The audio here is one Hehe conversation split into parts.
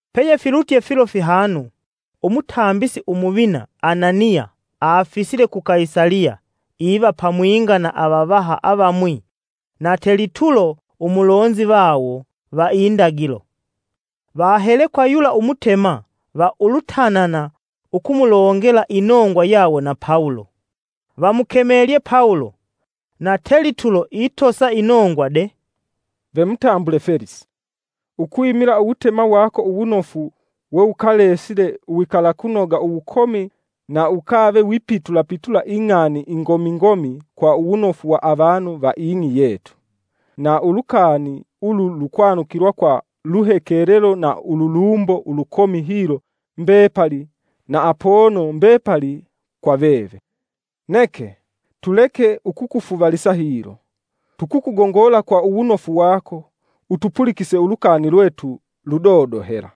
Peyefilutye filo fihanu, umutambisi Umuvina Ananiya afisile ku Kaisaliya iva pamwinga na avavaha avamwi na Telitulo umulonzi vawo va indagilo. Vahele kwa yula umutema va ulutanana ukumulongela inongwa yawo na Pawulo. Vamukemelye Pawulo, na Telitulo itosa inongwa de: “Ve mutambule Felisi, ukwimila uwutema wako uwunofu wewukalesile uwikalakunoga uwukomi na ukave wipitula pitula ing'ani ingomi ngomi kwa uwunofu wa avanu va ing'i yetu. Na ulukani ulu lukwanukilwa kwa luhekelelo na ululumbo ulukomi hilo mbepali na apono mbepali kwa veve. Neke, tuleke ukukufuvalisa hilo, tukukugongola kwa uwunofu wako, utupulikise ulukani lwetu ludodo hela.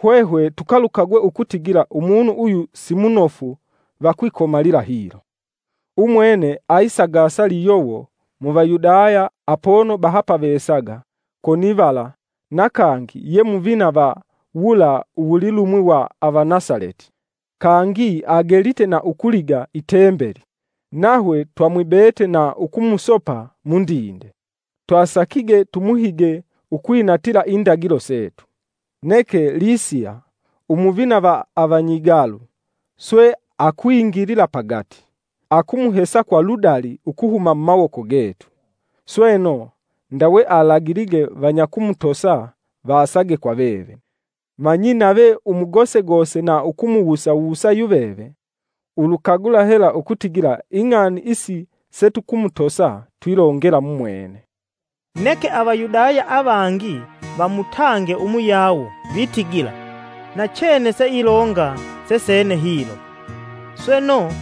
Hwehwe tukalukagwe ukutigila umunu uyu simunofu va kwikomalalila hilo. Umwene ayisagasa liyowo mu Vayudaya apono bahapavesaga konivala na kangi ye muvina va wula uwulilumwi wa Avanasaleti. Kangi agelite na ukuliga i Tembeli, nahwe twamwibete na ukumusopa mundinde. [Twasakige tumuhige ukwinatila Indagilo setu. Neke Lisiya, Umuvina va avanyigalu, swe akwingilila pagati, akumuhesa kwa ludali ukuhuma mumawoko getu. Sweno, ndawe alagilige vanyakumutosa vasage kwa veve.] Manyi nave umugosegose na ukumuwusa wusa yuveve, ulukagula hela ukutigila ing'ani isi setukumutosa twilongela mumwene.” Neke Avayudaya avangi vamutange umuyawo vitigila nachene seilonga sesene hilo. Sweno,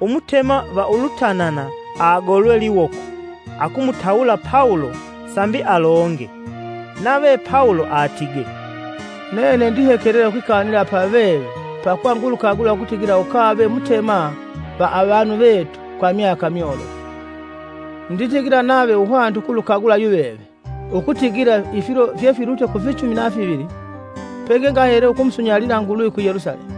Umutema va ulutanana agolwe liwoko akumutawula Pawulo sambi alonge. Nave Pawulo atige, “Nene ndihekelela ukwikanila pa veve pakuva ngulukagula ukutigila ukave mutema va avanu vetu kwa myaka myolofu. Nditigila nave uhwanite ukulukagula yuveve ukutigila ifilo fyefilutye kufinyichumi na fivili pengengahele ukumusunyalila Nguluvi ku Yelusalemu.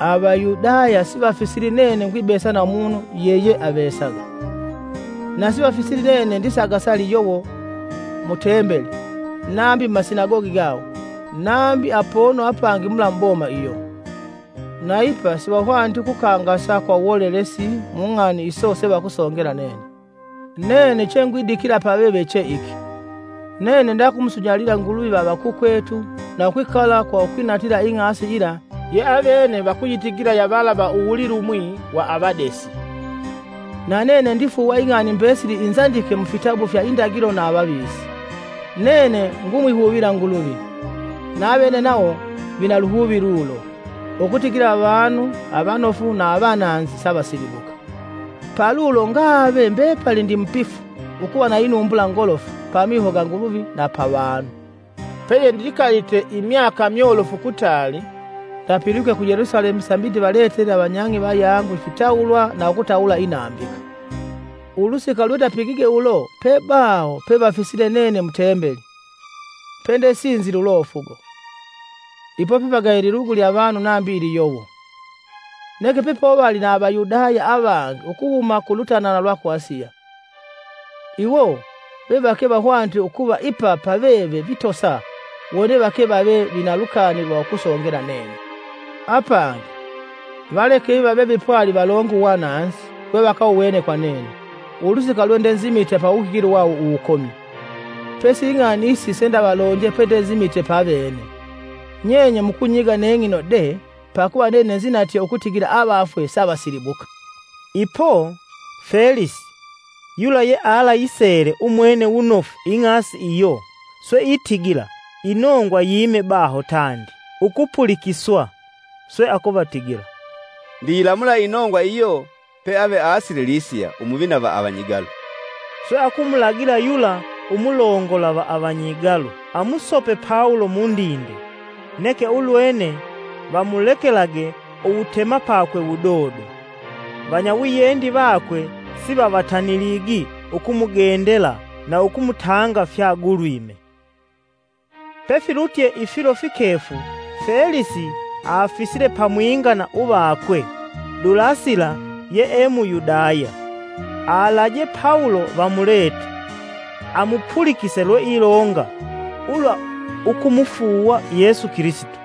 Avayudaya sivafisili nene ngwibesa na umunu yeyeavesaga. Na sivafisili nene ndisagasa liyowo mu Tembeli nambi mumasinagogi gawo nambi apono apangi mula muboma iyo. Na ipa sivahwaniti ukukangasa kwa uwolelesi mu ng'ani iso sevakusongela nene. Nene chengwidikila paveve che iki: Nene ndakumusunyalila Nguluvi va avakukwetu na ukwikala kwa ukwinatila Ing'asi yila ye avene vakuyitigila ya vala va uwulilumwi wa avadesi. Na nene ndifuuwa ing'ani mbesili inzandike mufitabu fya Indagilo na avavisi. Nene ngumwihuvila Nguluvi, na avene nawo vina luhuvi lulo, ukutigila avanu, avanofu na avananzi, savasilibuka. Palulo ngave mbepali ndimupifu ukuva na inumbula ngolofu pamiho ga Nguluvi na pavanu. “Peyendikalite imyaka myolofu kutaali, ndapilwike ku Yelusalemu sambi ndivaletele avanyang'i vayangu ifitawulwa na ukutawula inambika. Ulusika lwendapigige ulo pebaho pevafisile nene mu Tembeli, pendesinzile ulofugo. Ipo pepagaya ililugu lya avanu nambi iliyowo. Neke pepovali na Avayudaya avangi ukuhuma ku lutanana lwa ku Asiya; iwo vevake vahwanite ukuva ipa paveve vitosa wone vake vave vina lukani lwa ukusongela nene. Apangi, valeke iva vevipwali valonge uwananzi wevakawuwene kwa nene ulusika lwendenzimite pawuhigilo wawo uwukomi, pesi ing'ani isi sendavalonje pendenzimite pavene: ‘Nyenye mukunyiga neng'ino de pakuva nene nzinatye ukutigila avafwe savasilibuka!’” Ipo, Felisi, yula yealasisele umwene wunofu Ing'asi iyo, swe itigila inongwa yime baho tandi ukupulikiswa. Swe akuvatigila, “Ndiyilamula inongwa iyo peave asile Lisiya, Umuvina va avanyigalu.” Swe akumulagila yula umulongola va avanyigalu amusope Pawulo mundinde, neke ulwene vamulekelage uwutemapakwe wudodo, vanyawiyendi wakwe sivavatani ukumugendela na ukumutanga fyagulwime. Pefilutye ifilo fikefu, Felisi afisile pamwinga na uvakwe Dulasila yee Muyudaya. Alaje Pawulo vamulete, amupulikise lweilonga ulwa ukumufuuwa Yesu Kilisito.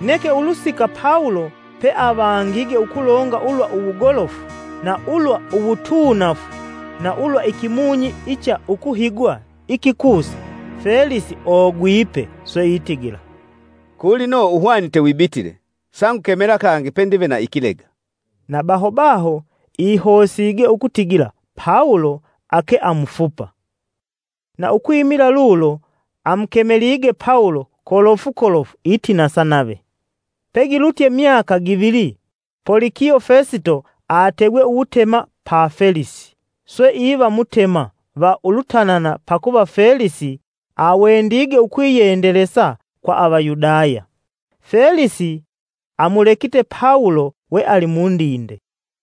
Neke ulusika Pawulo peavangige ukulonga ulwa uwugolofu, na ulwa uwutuunafu na ulwa ikimunyi icha ukuhigwa ikikusa, Felisi ogwipe, sweitigila, “Kulino uhwanite wibitile; sangukemela kangi pendive na ikilega.” Na baho baho ihosige ukutigila Pawulo ake amufupa. Na ukwimila lulo amukemelige Pawulo kolofu kolofu itinasa nave. Pegilutye myaka givili, Polikiyo Fesito ategwe uwutema pa Felisi, swe iva mutema va ulutanana pakuva Felisi awendige ukwiyendelesa kwa Avayudaya, Felisi amulekite Pawulo we ali mundinde.